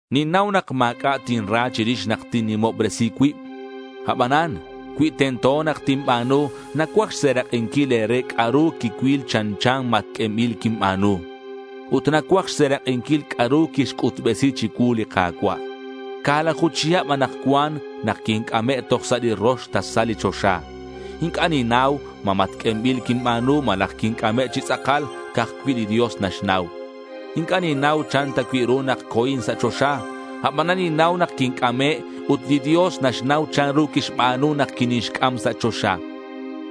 Ninnau nak ma̱c'a' tinra chirix nak tinnimobresi cuib. Abanan cui tento nak tinba̱nu, nacuaj xserak'inquil e̱re c'a'ru quicuil chanchan matq'uenbil quinba̱nu. Ut nacuaj xserak'inquil c'a'ru quixc'utbesi chicuu li Ka̱cua'. Ca̱laju chihab anakcuan nak quinc'ame' toj sa' li rox tasal li choxa. Inc'a' ninnau ma matq'uenbil quinba̱nu malaj quinc'ame' chi tz'akal. Ca'aj cui' li Dios naxnau. Inc'a' ninnau chan ta cui' ru nak co̱in sa' choxa. Abanan ninnau nak quinc'ame' ut li Dios naxnau chanru quixba̱nu nak quinixc'am sa' choxa.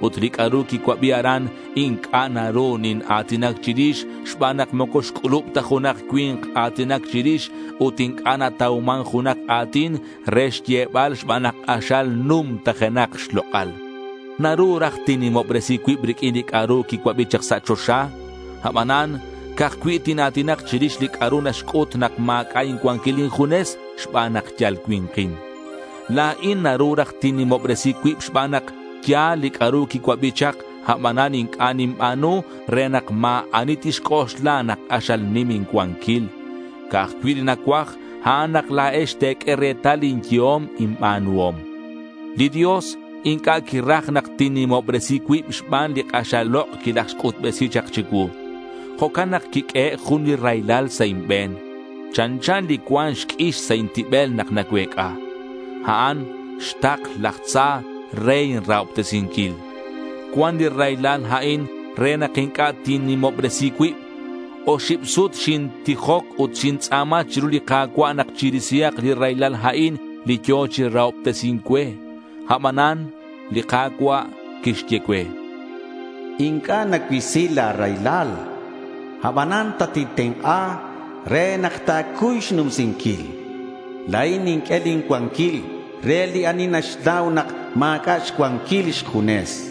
Ut li c'a'ru quicuabi aran inc'a' naru nina̱tinac chirix xban nak moco xc'ulub ta junak cui̱nk a̱tinac chirix ut inc'a' natauman junak a̱tin re xyebal xban nak k'axal numtajenak xlok'al. Naru raj tinnimobresi cuib riq'uin li c'a'ru quicuabi chak sa' choxa. Abanan ca'aj cui' tina̱tinak chirix li c'a'ru naxc'ut nak ma̱c'a' incuanquil injunes xban nak yal cui̱nkin. La̱in naru raj tinnimobresi cuib xban nak ya̱l li c'a'ru quicuabi chak, abanan inc'a' ninba̱nu re nak ma̱ ani tixc'oxla nak k'axal nim incuanquil. Ca'aj cui' li nacuaj, a'an nak la̱ex te̱q'ue retal lin yehom inba̱nuhom. Li Dios inc'a' quiraj nak tinnimobresi cuib xban li k'axal lok' quilajxc'utbesi chak chicuu. Jo'can nak quiq'uehe' jun li raylal sa' inbe̱n. Chanchan li cuan q'uix sa' intibel nak nacuec'a. A'an xtakl laj tza re inrahobtesinquil. Cuan li raylal a'in re nak inc'a' tinnimobresi cuib. Oxib sut xintijoc ut xintz'a̱ma chiru li Ka̱cua' nak chirisihak li raylal a'in li yo̱ chi rahobtesi̱nc cue. Abanan li Ka̱cua' quixye cue: Inc'a' nacuisi la̱ raylal. Abanan tatintenk'a re nak ta̱cuy xnumsinquil. La̱in ninq'ue lin cuanquil re li ani naxnau nak ma̱c'a' xcuanquil xjunes, chan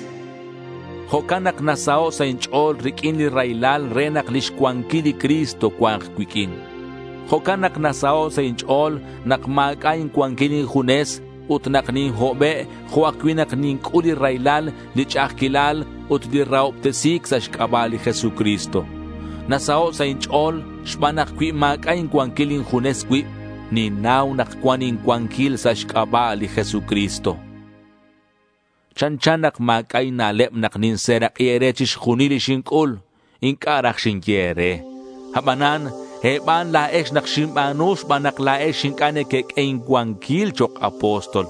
cue. Jo'can nak nasaho' sa' inch'o̱l riq'uin li raylal re nak lix cuanquil li Cristo cua̱nk cuiq'uin. Jo'can nak nasaho' sa' inch'o̱l nak ma̱c'a' incuanquil injunes ut nak ninhobe' jo' ajcui' nak ninc'ul li raylal, li ch'a'ajquilal ut li rahobtesi̱c sa' xc'aba' li Jesucristo. Nasaho' sa' inch'o̱l xban nak cui ma̱c'a' incuanquil injunes cuib, ninnau nak cuan incuanquil sa' xc'aba' li Jesucristo. Chanchan nak ma̱c'a' inna'leb nak ninserak'i e̱re chixjunil li xinc'ul. Inc'a' raj xinye e̱re. Abanan e̱ban la̱ex nak xinba̱nu xban nak la̱ex inc'a' nequeq'ue incuanquil chok' apóstol.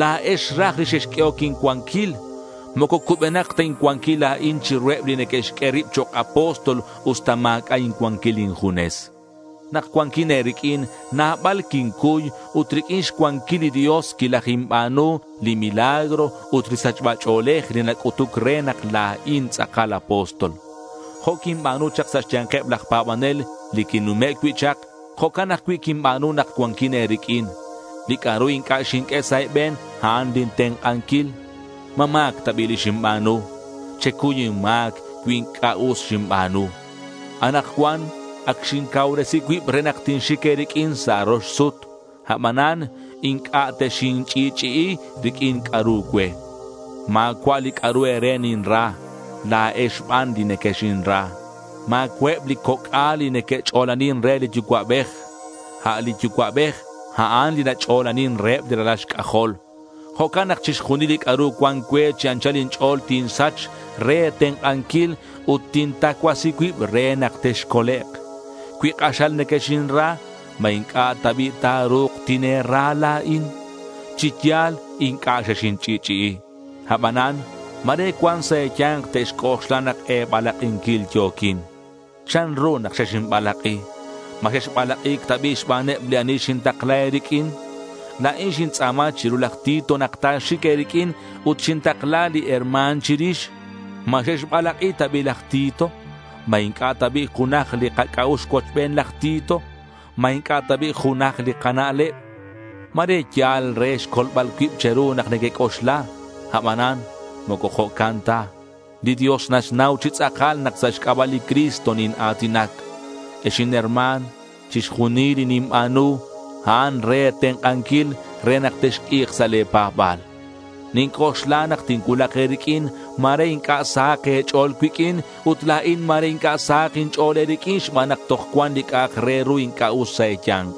La̱ex raj li xexq'uehoc incuanquil. Moco cubenak ta incuanquil la̱in chiruheb li neque'xq'ue rib chok' apóstol usta ma̱c'a' incuanquil injunes. Nak cuanquin e̱riq'uin nabal quincuy ut riq'uin xcuanquil li Dios quilajinba̱nu li milagro ut li sachba ch'o̱lej li nac'utuc re nak la̱in tz'akal apóstol. Jo' quinba̱nu chak sa' xya̱nkeb laj pa̱banel li quinnume' cui' chak, jo'can ajcui' quinba̱nu nak cuanquin e̱riq'uin. Li c'a'ru inc'a' xinq'ue sa' e̱be̱n, a'an lin tenk'anquil. ¿Ma ma̱c ta bi' li xinba̱nu? Checuy inma̱c cui inc'a' us xinba̱nu. Anakcuan ac xincauresi cuib re nak tinxic e̱riq'uin sa' rox sut. Abanan inc'a' texinch'i'ch'i'i riq'uin c'a'ru cue. Ma̱cua' li c'a'ru e̱re ninra. La̱ex ban li nequexinra. Ma̱cua'eb li coc'al li neque'ch'olanin re li yucua'bej. A' li yucua'bej, a'an li nach'olanin reheb li ralal xc'ajol. Jo'can nak chixjunil li c'a'ru cuan cue chi anchal inch'o̱l tinsach re e̱tenk'anquil ut tintacuasi cuib re nak texcolek'. Cui k'axal nequexinra, ¿ma inc'a' ta bi' ta̱ru̱k tine̱ra la̱in? Chi yal inc'a' xexinch'i'ch'i'i. Abanan ma̱re cuan sa' e̱ya̱nk te'xc'oxla nak e̱balak'inquil yo̱quin. ¿Chanru nak xexinbalak'i? ¿Ma xexbalak'i̱c ta bi' xbaneb li ani xintakla e̱riq'uin? La̱in xintz'a̱ma chiru laj Tito nak ta̱xic e̱riq'uin ut xintakla li herma̱n chirix. ¿Ma xexbalak'i ta bi' laj Tito? ¿Ma inc'a' ta bi' junaj li kac'a'ux cuochben laj Tito? ¿Ma inc'a' ta bi' junaj li kana'leb? Ma̱re yal re xcolbal cuib che̱ru nak nequec'oxla. Abanan moco jo'can ta. Li Dios naxnau chi tz'akal nak sa' xc'aba' li Cristo nina̱tinac. Ex inherma̱n, chixjunil li ninba̱nu, a'an re e̱tenk'anquil re nak texq'ui̱k sa' le̱ pa̱ba̱l. Ninc'oxla nak tincuulak e̱riq'uin ma̱re inc'a' sahak e̱ch'o̱l cuiq'uin, ut la̱in ma̱re inc'a' sahak inch'o̱l e̱riq'uin xban nak toj cuan li c'a'ak re ru inc'a' us sa' e̱ya̱nk.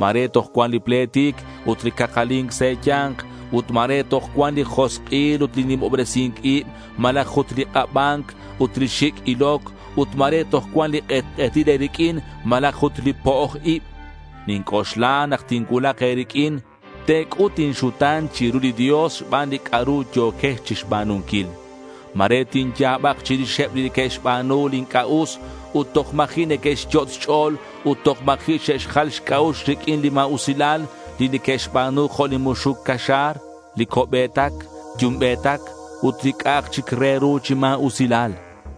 Ma̱re toj cuan li pletic ut li cakali̱nc sa' e̱ya̱nk ut ma̱re toj cuan li josk'il ut li nimobresi̱nc ib, malaj ut li k'aba̱nc ut li xic' iloc ut ma̱re toj cuan li k'etk'etil e̱riq'uin malaj ut li po'oj ib. Ninc'oxla nak tincuulak e̱riq'uin, te̱c'ut inxuta̱n chiru li Dios xban li c'a'ru yo̱quex chixba̱nunquil. Ma̱re tinya̱bak chirixeb li que'xba̱nu li inc'a' us ut toj ma̱ji' neque'xyot' xch'o̱l ut toj ma̱ji' xe'xjal xc'a'ux riq'uin li ma̱usilal li que'xba̱nu jo' li muxuc caxa̱r, li co'be̱tac yumbe̱tac ut li c'a'ak chic ru chi ma̱usilal.